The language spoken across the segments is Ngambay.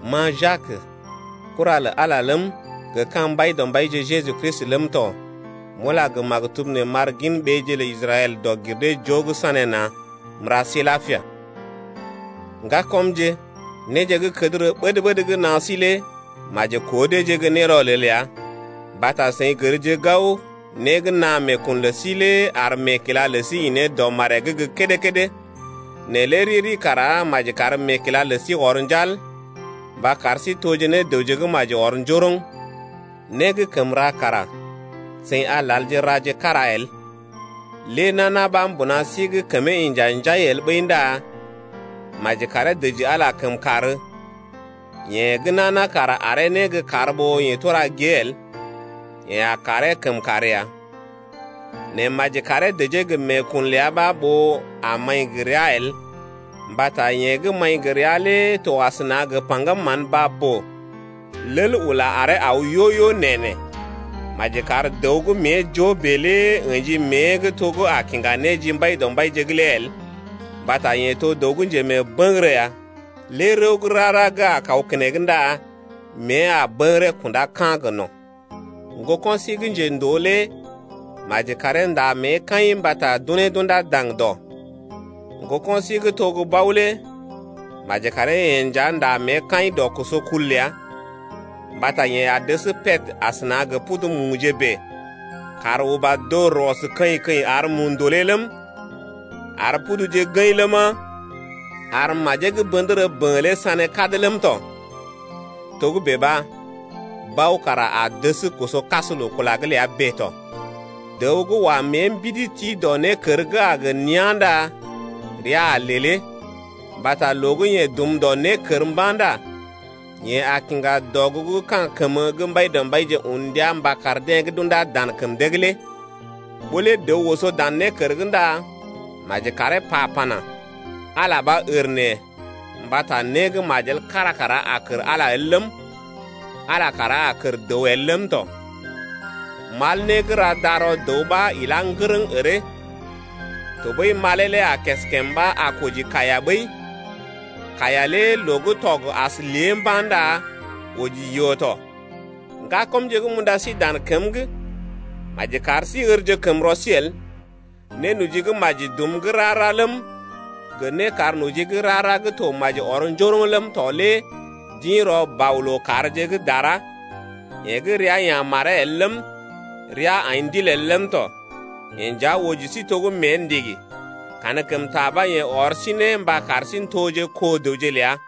Ma Jak, kura lə Ala ləm, gə ka̰ Mbaidɔmbaije Jeju Kristi ləm tɔ, m’ula gə maktub nee m’ar gin ɓeeje lə Israɛl dɔg-gir-dee-joo gə́ sanéna̰. M’ra sí lapia! Ŋgakɔmje, néje gə́ kədərə ɓəd-ɓəd gə́ naa sí lé maji koo deeje gə́ nérɔlel ya, mbata seḭ gərje gao, né gə́ naa meekun lə sí lé ar meekila lə sí ḭ ne dɔ maree’g gə́ kédé-kédé. Nɛ lé riri kara maji kar meekila lə sí ɔr njal, mba kar sí toje ne dəwje gə́ maji ɔr njoroŋ, né gə́ kəm ra kara seḭ a lalje raje kára el. Lé nana ɓa mbuna sí’g kəmee inja njai el ɓəi ndá maji karee dəji Ala kəmkàr, yeḛ gə́ nana kara aree né gə́ kar ɓó yeḛ tura gée el, yeḛ a karee kəmkàr ya. Nɛ maji karee dəjee gə meekun ləa ɓa ɓó a maḭ gə rəa el, mbata yeḛ gə́ maḭ gə rəa lé to asəna gə paŋgəm mán baa-boo, lel ula aree aw yo-yo nee-nee. Maji kar dəw gə́ mée joo bèe lé ə̰ji mée’g to gə́ a gə kiŋga né ji Mbaidɔmbaije’g lé el. Mbata yeḛ to dəw gə́ njemeebəŋgərə ya, lé rəw gə́ rara gə́ a kaw keneŋ ndá mée a bəŋgəree kunda ka̰ gə no̰ ya. Ŋgoko̰ sí gə́ njendoo lé maji karee nda mée kaḭ mbata d’unee d’unda daŋdɔ. Ŋgoko̰ sí gə́ to gə́ bao lé maji karee-yeḛ nja nda mée kaḭ dɔ koso kul’g ləa, mbata yeḛ a dəs pèd asəna gə pudu muje bèe. Kàr uba dor ɔs keḭ-keḭ ar mu ndòlé ləm, ar puduje gəḭ ləma, ar majee gə́ bə̰dərə bə̰ lé sané kad ləm tɔ. Togə́bè ɓa, bao kara a dəs koso kas loo-kula’g ləa bèe tɔ. Dəw gə́ wa mée mbidi ti dɔ nékər gə́ a gə neán ndá rəa a lelee, mbata loo gə́ yeḛ dum dɔ nékər mba̰ ndá yeḛ a kiŋga dɔgugu gə́ ka̰ kəmə gə́ Mbaidɔmbaije un ndia mba kar deḛ gə́ d’undá dan kəm dee’g lé. Ɓó lé dəw oso dan nékər’g ndá maji karee pa pana: Ala ɓa ər neḛ mbata né gə́ majel kar kara a kər Ala el ləm, Ala kara a kər dəw el ləm tɔ. Mal né gə́ ra darɔ dəw ɓa ilá ŋgərəŋ əree. Tɔɓəi malee lé a keskèm ɓa a koji kaiya ɓəi. Kaiya lé loo gə́ tɔg as lée mba̰ ndá oji yoo tɔ. Ŋgakɔmje gə́ m’unda sí dan kəm’g, maji kar sí ərje kəm rɔ sí el. Nénoji gə́ maji dum gə́ rara ləm, gə nékarnoji gə́ rara gə́ to maji ɔr njoroŋ ləm tɔ lé d’ḭ rɔ Bɔ lookàrje gə́ dara, yeḛ gə́ rəa ya̰ maree el ləm, loo gə́ ndul ɗig godo rəa’g ləm tɔ. Yeḛ nja oji sí to gə́ mée ndigi, kankəmta ɓa yeḛ ɔr sí ne mba kar sí n’toje ne kó dəwje ləa.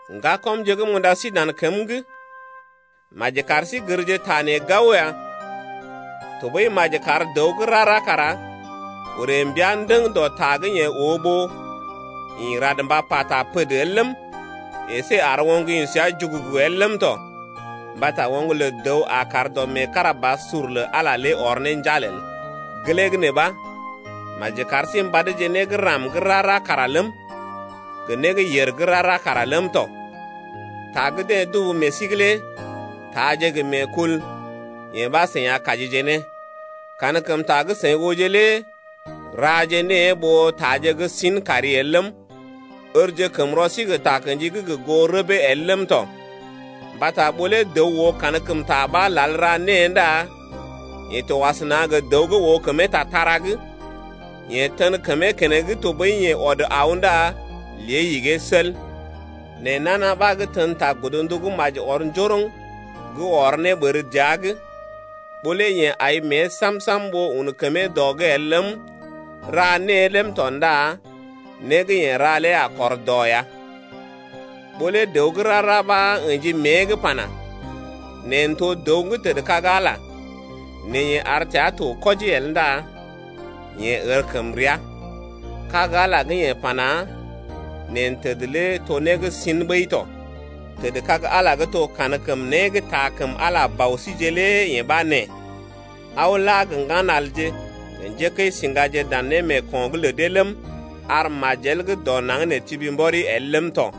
Ŋgakɔmje gə́ m’unda sí dan kəm’g, maji kar sí gərje ta nee gao ya. Tɔɓəi maji kar dəw gə́ rara kara orè mbia ndəŋ dɔ ta gə́ yeḛ oo ɓó ḭ rad mba pata pəd el ləm, əsé ar oŋg ḭ səa jugugu el ləm tɔ, mbata oŋg lə dəw a kar dɔ meekarabasur lə Ala ɔr ne njal el. Gelee gə́ nee ɓa maji kar sí mbadje né gə́ ram gə́ rara kara ləm, gə né gə́ yèr gə́ rara kara ləm tɔ. Ta gə́ deḛ dubu meḛ sí’g lé ndá taaje gə meekul, yee ɓa seḭ a kajije ne ya. Kankəmta gə́ seḭ ooje lé raje née ɓó taaje gə́ sin kari el ləm, ərje kəm rɔ sí gə takə̰ji gə́ gə goo rəbee el ləm tɔ. Mbata ɓó lé dəw oo kankəmta ɓa lal ra née ndá yeḛ to asəna gə dəw gə́ oo kəmee tatara’g, yeḛ tən kəmee keneŋ tɔɓəi yeḛ ɔd aw ndá lée igee el. Nɛ nana ɓa gə́ tən ta godndu gə́ maji ɔr njoroŋ gə́ ɔr ne ɓər dəa’g, ɓó lé yeḛ ai mée sam-sam ɓó un kəmee dɔ’g el ləm, ra née ləm tɔ ndá né gə́ yeḛ ra lé a kɔr dɔ ya. Ɓó lé dəw gə́ rara ɓa, ə̰ji mée’g pana: Neḛ n’to dəw gə́ tədkag Ala, nɛ yeḛ ar təa to kwɔji el ndá yeḛ ər kəm rəa, kag Ala gə́ yeḛ pana: Neḛ təd lé to né gə́ sḭ ɓəi tɔ. Tədkag Ala gə́ to kankəm né gə́ taa kəm Ala Ɓɔsíje lé yee ɓa nee: Aw la gə ŋganalje gə njékəisiŋgaje dan némeeko̰’g lə dee ləm, ar majel gə́ dɔ naŋg nee tibi mbɔri el ləm tɔ.